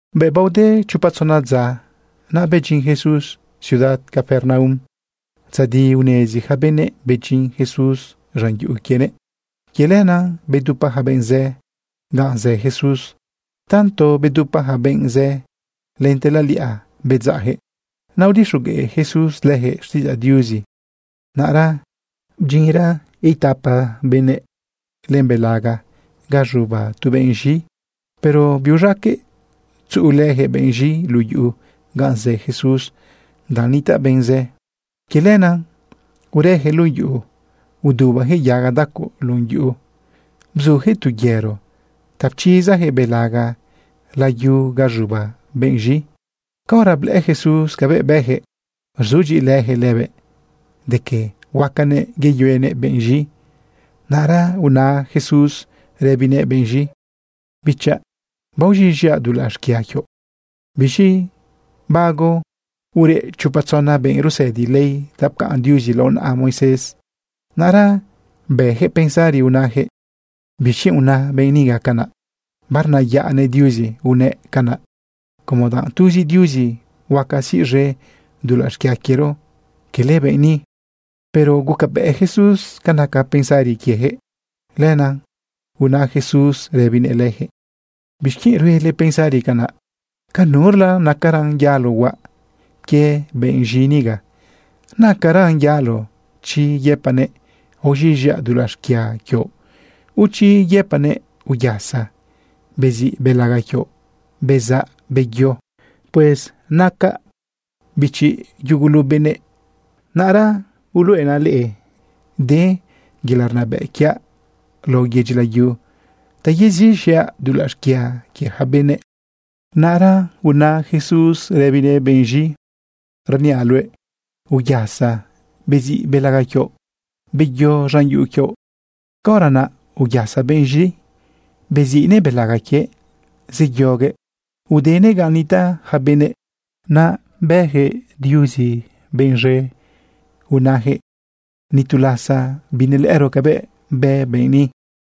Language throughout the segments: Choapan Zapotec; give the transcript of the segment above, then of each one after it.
Bëꞌ baode chopa tzona dza, naꞌ bedyin Jesús ciudad Capernaum. Tzadi unezi yaca benëꞌ bedyin Jesús z̃an yuꞌu quienëꞌ. Quie lenaꞌ bedupa yaca benꞌ zë ganꞌ zë Jesús. Tanto bedupa yaca benꞌ zë, lente laliꞌa bedzaꞌyaquëꞌ. Naꞌ udixogueꞌ Jesús leyaquëꞌ xtiꞌidzaꞌ Diuzi. Naꞌra bdyinra itapa benëꞌ len belaga ga z̃uba tu benꞌ z̃i. Pero biuz̃aqueꞌ tzuꞌulëyaquëꞌ benꞌ z̃i luꞌu yuꞌu ganꞌ zë Jesús, danꞌ nitaꞌ benꞌ zë. Quie lenaꞌ urëyaquëꞌ lun yuꞌu, udubayaquëꞌ yaga dacoꞌ lun yuꞌu, bzuyaquëꞌ tu yëro ta pchizayaquëꞌ belaga layu ga z̃uba benꞌ z̃i. Caora blëꞌë Jesús cabëꞌ bëyaquëꞌ rzudyiꞌilëyaquëꞌ lëbëꞌ de que huacanëꞌ yeyuenëꞌ benꞌ z̃i, naꞌra unë Jesús rëbinëꞌ benꞌ z̃i: ―Bichaꞌ, baoz̃iꞌz̃iaꞌ dulaꞌ xquia quioꞌ. Biz̃i bago ureꞌ chopa tzona benꞌ rusëdi ley ta pcaꞌn Diuzi lao naꞌa Moisés. Naꞌra bëyaquëꞌ pensari unayaquëꞌ: “¿Bixquienꞌ una benꞌ niga canaꞌ? Barnayaꞌnëꞌ Diuzi unëꞌ canaꞌ como danꞌ tuzi Diuzi huaca siꞌz̃e dulaꞌ xquia quiero, quele benꞌ ni.” Pero gucabëꞌ Jesús ca naca pensari quieyaquëꞌ. Lenaꞌ una Jesús rëbinëꞌ leyaquëꞌ: ―¿Bixquienꞌ ruele pensari canaꞌ? ¿Ca nurlan nacaran yalo huaꞌ quie benꞌ z̃i niga? ¿Nacaran yalo chi yëpaꞌnëꞌ: “Aoz̃iꞌz̃iaꞌ dulaꞌ xquia quioꞌ”, o chi yëpaꞌnëꞌ: “Uyasa, beziꞌ belaga quioꞌ, bezaꞌ beyo”? Pues nacaꞌ bichi yugulu benëꞌ. Naꞌra uluꞌenaꞌ leꞌe de yelaꞌ rnabëꞌ quiaꞌ lao yedyi layu ta yeziꞌz̃iaꞌ dulaꞌ xquia quie yaca benëꞌ. Naꞌra una Jesús rëbinëꞌ benꞌ z̃i: ―Rniaꞌ luëꞌ, uyasa, beziꞌ belaga quioꞌ, beyo z̃an yuꞌu quioꞌ. Caora naꞌ uyasa benꞌ z̃i, beziꞌnëꞌ belaga quiëꞌ, zeyoguëꞌ, udenëꞌ ganꞌ nitaꞌ yaca benëꞌ. Naꞌ bëyaquëꞌ Diuzi benꞌ z̃e unayaquëꞌ: ―Ni tu lasa binelëꞌëro cabëꞌ bë benꞌ ni.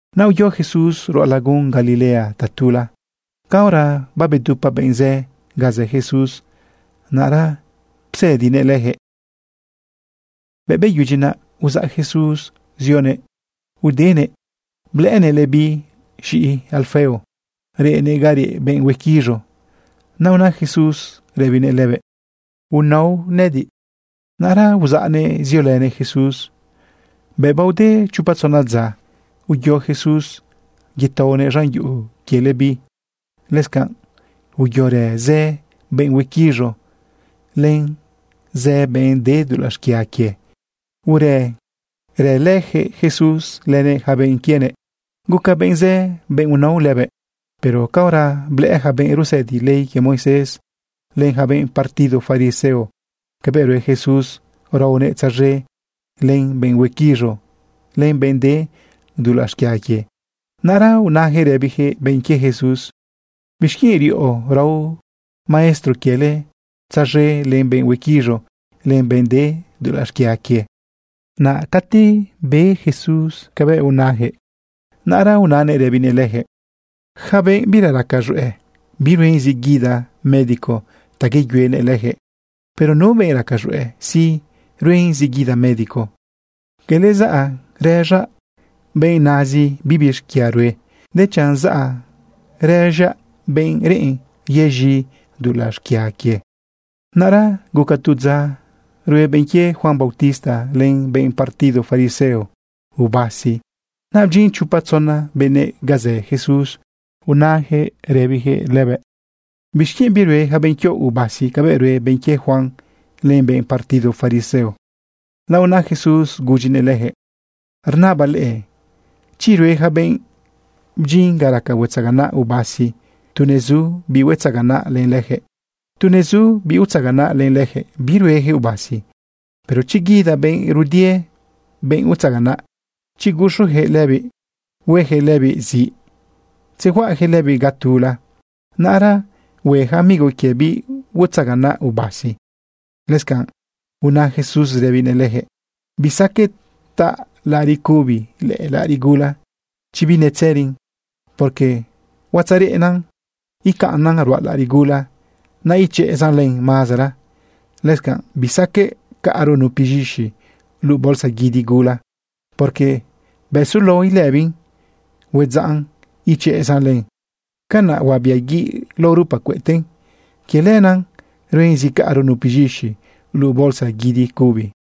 Naꞌ uyo Jesús ruꞌa lagun Galilea tatula. Caora babedupa benꞌ zë ga zë Jesús, naꞌra psëdinëꞌ leyaquëꞌ. Bëꞌ beyudyi naꞌ, uzaꞌ Jesús zionëꞌ udenëꞌ blëꞌënëꞌ Leví, z̃iꞌi Alfeo, reꞌnëꞌ ga reꞌ benꞌ huequiz̃u. Naꞌ una Jesús rëbinëꞌ lëbëꞌ: ―Unao nëꞌëdiꞌ. Naꞌra uzaꞌnëꞌ ziolënëꞌ Jesús. Bëꞌ baode chopa tzona dza, uyo Jesús yetaonëꞌ z̃an yuꞌu quie Leví. Lëscanꞌ uyorë zë benꞌ huequiz̃u len zë benꞌ de dulaꞌ xquia quie, ureꞌrëlëyaquëꞌ Jesús lënëꞌ yaca benꞌ quienëꞌ. Guca benꞌ zë, benꞌ unao lëbëꞌ. Pero caora blëꞌë yaca benꞌ rusëdi ley quie Moisés len yaca benꞌ partido fariseo cabëꞌ rue Jesús, raonëꞌ tzaz̃e len benꞌ huequiz̃u len benꞌ de dulaꞌ xquia quie, naꞌra unayaquëꞌ rëbiyaquëꞌ benꞌ quie Jesús: ―¿Bixquienꞌ riꞌo rao maestro quiele tzaz̃e len benꞌ huequiz̃u len benꞌ de dulaꞌ xquia quie? Naꞌ cati babe Jesús cabëꞌ unayaquëꞌ, naꞌra unënëꞌ rëbinëꞌ leyaquëꞌ: ―Yaca benꞌ biraca z̃hueꞌ, biruen zi guida médico ta yeyuenëꞌ leyaquëꞌ. Pero nu benꞌ raca z̃hueꞌ, sí ruen zi guida médico. Quele zaꞌ rëz̃aꞌ benꞌ nazi bibi xquia rue, dechanꞌ zaꞌ rëz̃aꞌ benꞌ reꞌen yez̃i dulaꞌ xquia quie. Naꞌra guca tu dza rue benꞌ quie Juan bautista len benꞌ partido fariseo ubasi, naꞌ bdyin chopa tzona benëꞌ ga zë Jesús unayaquëꞌ lëbëꞌ: ―¿Bixquienꞌ birue yaca benꞌ quioꞌ ubasi cabëꞌ rue benꞌ quie Juan len benꞌ partido fariseo? Naꞌ una Jesús gudyinëꞌ leyaquëꞌ: ―¿Rnabaꞌ leꞌe chi rue yaca benꞌ bdyin ga raca huetzaganaꞌ ubasi tu nezu biꞌ utzaganaꞌ len leyaquëꞌ? Tu nezu biꞌ utzaganaꞌ len leyaquëꞌ, birueyaquëꞌ ubasi. Pero chi guida benꞌ rudie benꞌ utzaganaꞌ, chi guxuyaquëꞌ lëbiꞌ, hueyaquëꞌ lëbiꞌ ziꞌ, tzehuaꞌayaquëꞌ lëbiꞌ ga tula, naꞌra hue yaca amigo quie biꞌ utzaganaꞌ ubasi. Lëscanꞌ una Jesús rëbinëꞌ leyaquëꞌ: ―Bisaqueꞌ taꞌ laꞌariꞌ cubi lëꞌë laꞌariꞌ gula chi binetzërin, porque huetzereꞌnan icanan ruꞌa laꞌariꞌ gula, naꞌ ichezan len mazara. Lëscanꞌ bisaqueꞌ caꞌro nupi z̃ixi luꞌu bolsa guidi gula, porque bëꞌ sulao ilëbin, huedzaꞌn ichezan len. Canaꞌ huabiaguiꞌ lao rupa cueꞌten. Quie lenaꞌ ruen zi caꞌro nupi z̃ixi luꞌu bolsa guidi cubi.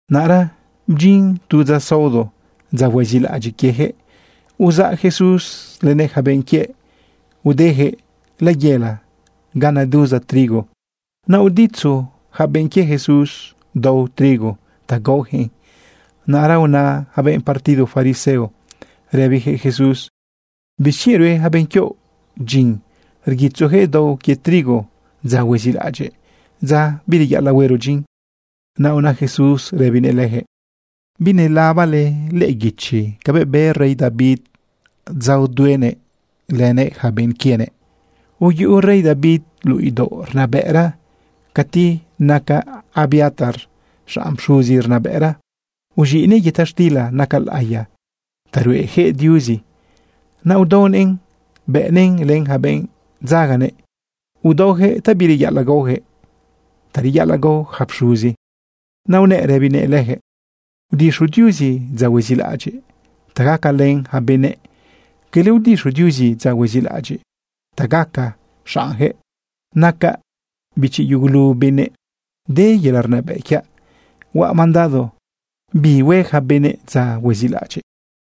Naꞌra bdyin tu dza saodo, dza huezilaꞌadyiꞌ quieyaquëꞌ, uzaꞌ Jesús lënëꞌ yaca benꞌ quiëꞌ udeyaquëꞌ layela ga neduza trigo. Naꞌ uditzu yaca benꞌ quie Jesús dao trigo ta gaoyaquëꞌn. Naꞌra una yaca benꞌ partido fariseo rëbiyaquëꞌ Jesús: ―¿Bixquienꞌ rue yaca benꞌ quioꞌ dyin rguitzuyaquëꞌ dao quie trigo dza huezilaꞌadyiꞌ, dza bireyaꞌalaꞌ huero dyin? Naꞌ una Jesús rëbinëꞌ leyaquëꞌ: ―¿Binulabale lëꞌë guichi cabëꞌ bë rey David dza uduenëꞌ lënëꞌ yaca benꞌ quiëꞌ? Uyuꞌu rey David luꞌu idaoꞌ rnabëꞌra cati naca Abiatar xaꞌn pxuzi rnabëꞌra, uz̃iꞌnëꞌ yëta xtila naca laꞌiya ta ruꞌeyaquëꞌ Diuzi. Naꞌ udaonëꞌn bëꞌnëꞌn len yaca benꞌ dzaganëꞌ, udaoyaquëꞌ ta bireyaꞌalaꞌ gaoyaquëꞌ, ta reyaꞌalaꞌ gao yaca pxuzizi. Naꞌ unëꞌ rëbinëꞌ leyaquëꞌ: ―Udixu Diuzi dza huezilaꞌadyiꞌ ta gacalën yaca benëꞌ. Quele udixu Diuzi dza huezilaꞌadyiꞌ ta gaca xaꞌnyaquëꞌ. Nacaꞌ bichi yugulu benëꞌ. De yelaꞌ rnabëꞌ quiaꞌ huaꞌ mandado bi hue yaca benëꞌ dza huezilaꞌadyiꞌ.